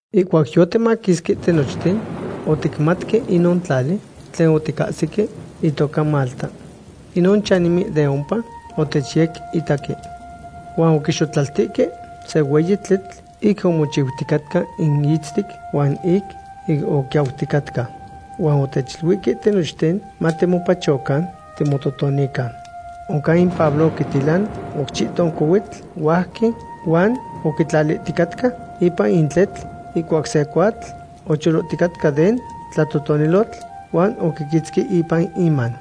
Ihcuac yotimaquisque tinochten, oticmatque inon tlali tlen oticahsique itoca Malta. Inon chanimen de ompa otechyequitaque. Huan oquixotlaltihque se hueyi tletl ic omochiuticatca in itztic huan ic oquiauticatca. Huan otechiluihque tinochten matimopachocan timototonican. Oncan in Pablo oquitilan oc chihton cohuitl huajqui huan oquitlalihticatca ipan in tletl ihcuac se cuatl ocholohticatca den tlatotonilotl huan oquiquitzqui ipan iman.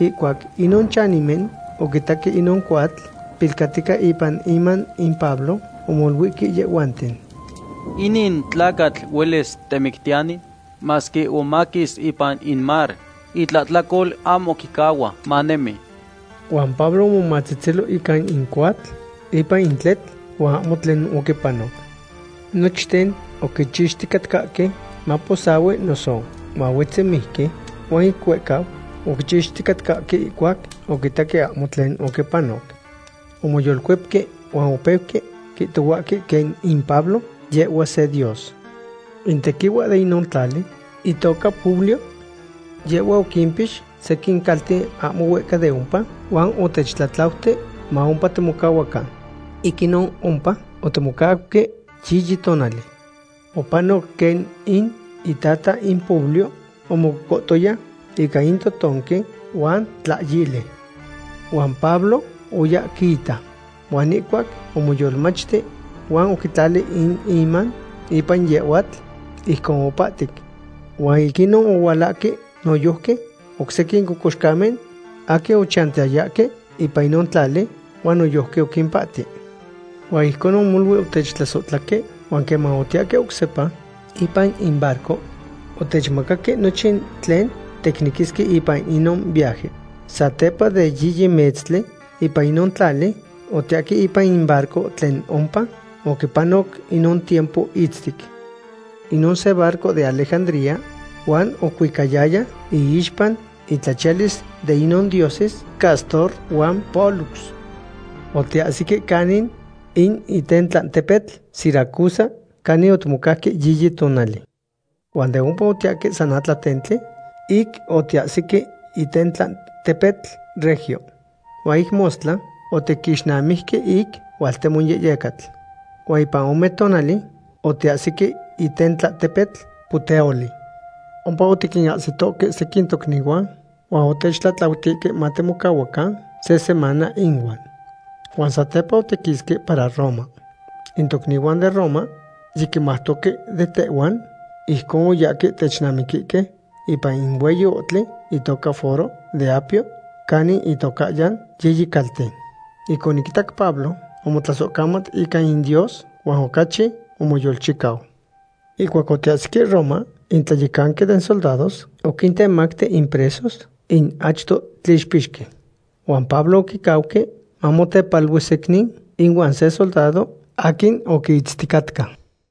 Ihcuac inon chanimen oquitaque inon cuatl pilcatica ipan iman in Pablo, omoluihque yehhuanten: ―Inin tlacatl huelis temictiyani, masque omaquis ipan in mar, itlahtlacol ahmo quicahua manemi. Huan Pablo omomatzetzelo ica in cuatl ipan in tletl, huan ahmo tlen oquipanoc. Nochten oquichixticatcahque maposahui noso mahuetzi mijqui, huan ic huehcau oquichixticatcahque ihcuac oquitaque ahmo tlen oquipanoc. Omoyolcuepque huan opeuque quihtohuahque quen in Pablo yehhua se dios. In tequihua de inon tlali itoca Publio. Yehhua oquimpix sequin calten ahmo huehca de ompa, huan otechtlatlauti ma ompa timocahuacan. Ic inon ompa otimocauque yiyi tonali. Opanoc quen in itata in Publio omococohtoya ica in totonqui huan tlahyili. Huan Pablo oya quiita. Huan ihcuac omoyolmachti huan oquitlali in iman ipan yehhuatl, ijcon opahtic. Huan ic inon ohualahque noyojqui oc sequin cocoxcamen aquin ochantiyayahque ipan inon tlali, huan noyojqui oquimpahti. Huan ijcon molui otechtlasohtlahque huan queman otiyahque oc sepa ipan in barco, otechmacaque nochin tlen ticnequisque ipan inon viaje. Satepa de yiyi metztli ipan inon tlali, otiyahque ipan in barco tlen ompa oquipanoc inon tiempo itztic. Inon se barco de Alejandría huan ocuicayaya iixpa intlachialis de inon dioses Cástor huan Pólux. Otiyahsique canin in itentlatepetl Siracusa canin otimocauque yiyi tonali. Huan de ompa otiyahque san atlatentli ic otiyahsique itentlatepetl Regio. Huan ic mostla otiquixnamijque ic hualtemo yehyecatl. Huan ipan ome tonali otiyahsique itentlatepetl Puteoli. Ompa otiquinahsitohque sequin tocnihuan huan otechtlatlautihque matimocahuacan se semana inuan. Huan satepa otiquisque para Roma. In tocnihuan den Roma yiquimautoque de tehhuan, ijcon oyahque technamiquihque ipan in hueyi ohtli itoca Foro de Apio canin itocahyan Yiyi Calten. Ic oquinitac Pablo, omotlasohcamat ica in Dios huan ocachi omoyolchicau. Ihcuac otiyahsique Roma, in tlayecanqui den soldados oquintemacti in presos in achto tlixpixqui. Huan Pablo oquicauque mamotepalui secnin ihuan se soldado aquin oquiitzticatca.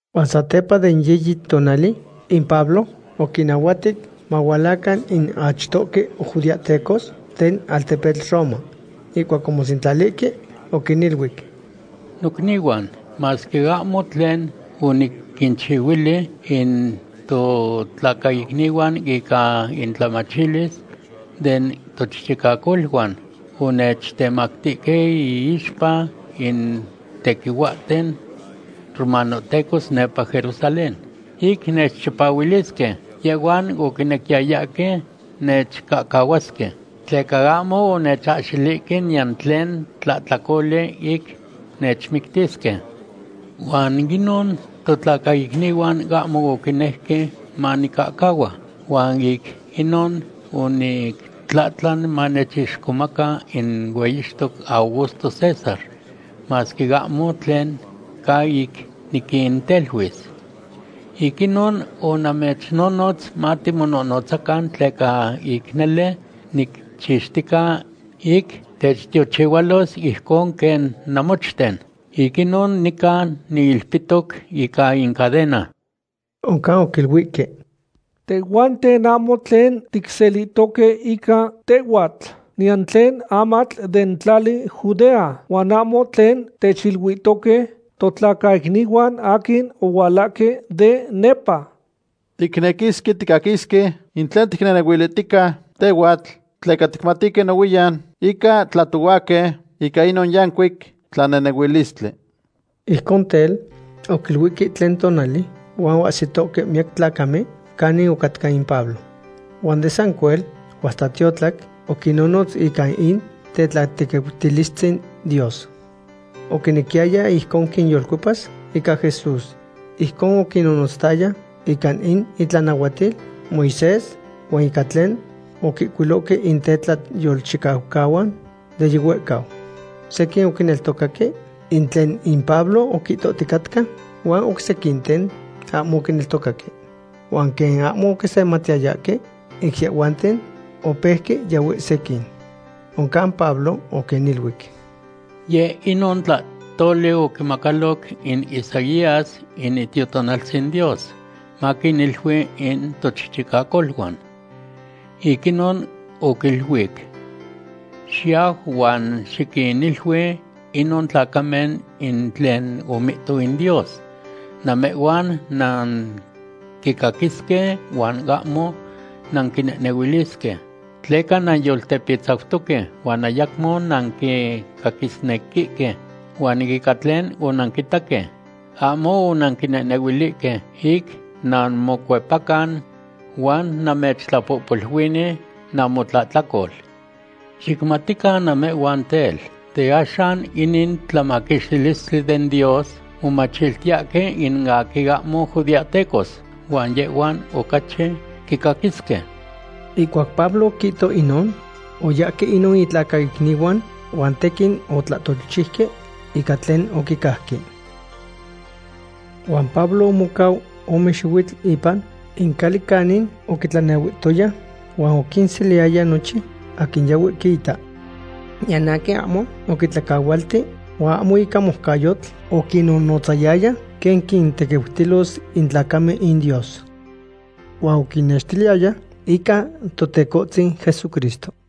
Huan satepa den yiyi tonali in Pablo oquinnahuatic mahualacan in achtohque judeahtecos den altepetl Roma. Ihcuac omosentlalihque, oquiniluic: ―Nocnihuan, masque ahmo tlen oniquinchihuili in totlacaicnihuan ica intlamachilis den tochichicacoluan, onechtemactihque iixpa in tequihuahten romanohtecos nepa Jerusalén. Ic nechchipahuilisque, yehhuan oquinequiyayahque nechcahcahuasque, tleca ahmo onechahxilihque niyan tlen tlahtlacoli ic nechmictisque. Huan inon totlacaicnihuan ahmo oquinejque manicahcahua, huan ic inon onictlahtlan manechixcomaca in hueyixtoc Augusto César, masque ahmo tlen ca ic niquinteluis. Ic inon onamechnonotz matimonohnotzacan, tleca ic nele nicchixtica ic techtiochihualos ijcon quen namochten. Ic inon nica niilpitoc ica in cadena. Oncan oquiluihque: ―Tehhuanten ahmo tlen ticselihtoque ica tehhuatl, niyan tlen amatl den tlali Judea, huan ahmo tlen techiluihtoque totlacaicnihuan aquin ohualahque de nepa. Ticnequisque ticaquisque in tlen ticnehnehuilihtica tehhuatl, tleca ticmatihque nohuiyan ica tlahtohuahque ica inon yancuic tlanehnehuilistli. Ijcon tel, oquiluihque tlen tonali huan oahsitohque miyac tlacamen canin ocatca in Pablo. Huan de sancuel huan hasta tiotlac oquinnonotz ica in tetlatequiutilistzin Dios. Oquinequiyaya ijcon quinyolcuepas ica Jesús. Ijcon oquinnonotzayaya ica in itlanahuatil Moisés, huan ica tlen oquihcuilohque in tetlayolchicaucahuan de yihuehcau. Sequin oquineltocaque in tlen in Pablo oquihtohticatca, huan oc sequinten ahmo oquineltocaque. Huan quen ahmo oquisematiyayahque ic yehhuanten, opeuque yahue sequin. Oncan Pablo oquiniluic: ―Yec inon tlahtoli oquimacaloc in Isaías in Itiotonaltzin Dios, maquinilui in tochichicacoluan. Ic inon oquiluic: Xiyau huan xiquinilui inon tlacamen in tlen omihto in Dios: “Namehhuan nanquicaquisque huan ahmo nanquinehnehuilisque. Tleca nanyoltepitzautoque huan ayacmo nanquicaquisnequihque. Huan ica tlen onanquitaque, ahmo onanquinehnehuilihque, ic nanmocuepacan huan namechtlapohpoluini namotlahtlacol.” Xicmatican namehhuan tel, de axan inin tlamaquixtilistli den Dios momachiltiyahque in aquin ahmo judeahtecos, huan yehhuan ocachi quicaquisque. Ihcuac Pablo oquihto inon, oyahque inon itlacaicnihuan huan tequin otlahtolchiuque ica tlen oquicajque. Huan Pablo omocau ome xihuitl ipan in cali canin oquitlanehuihtoya huan oquinseliyaya nochin aquin yahue quiita. Niyan aquin ahmo oquitlacahualti huan ahmo ica moucayotl oquinonotzayaya quen quintequiutilos in tlacamen in Dios. Huan oquinextiliyaya ica Totecohtzin Jesucristo.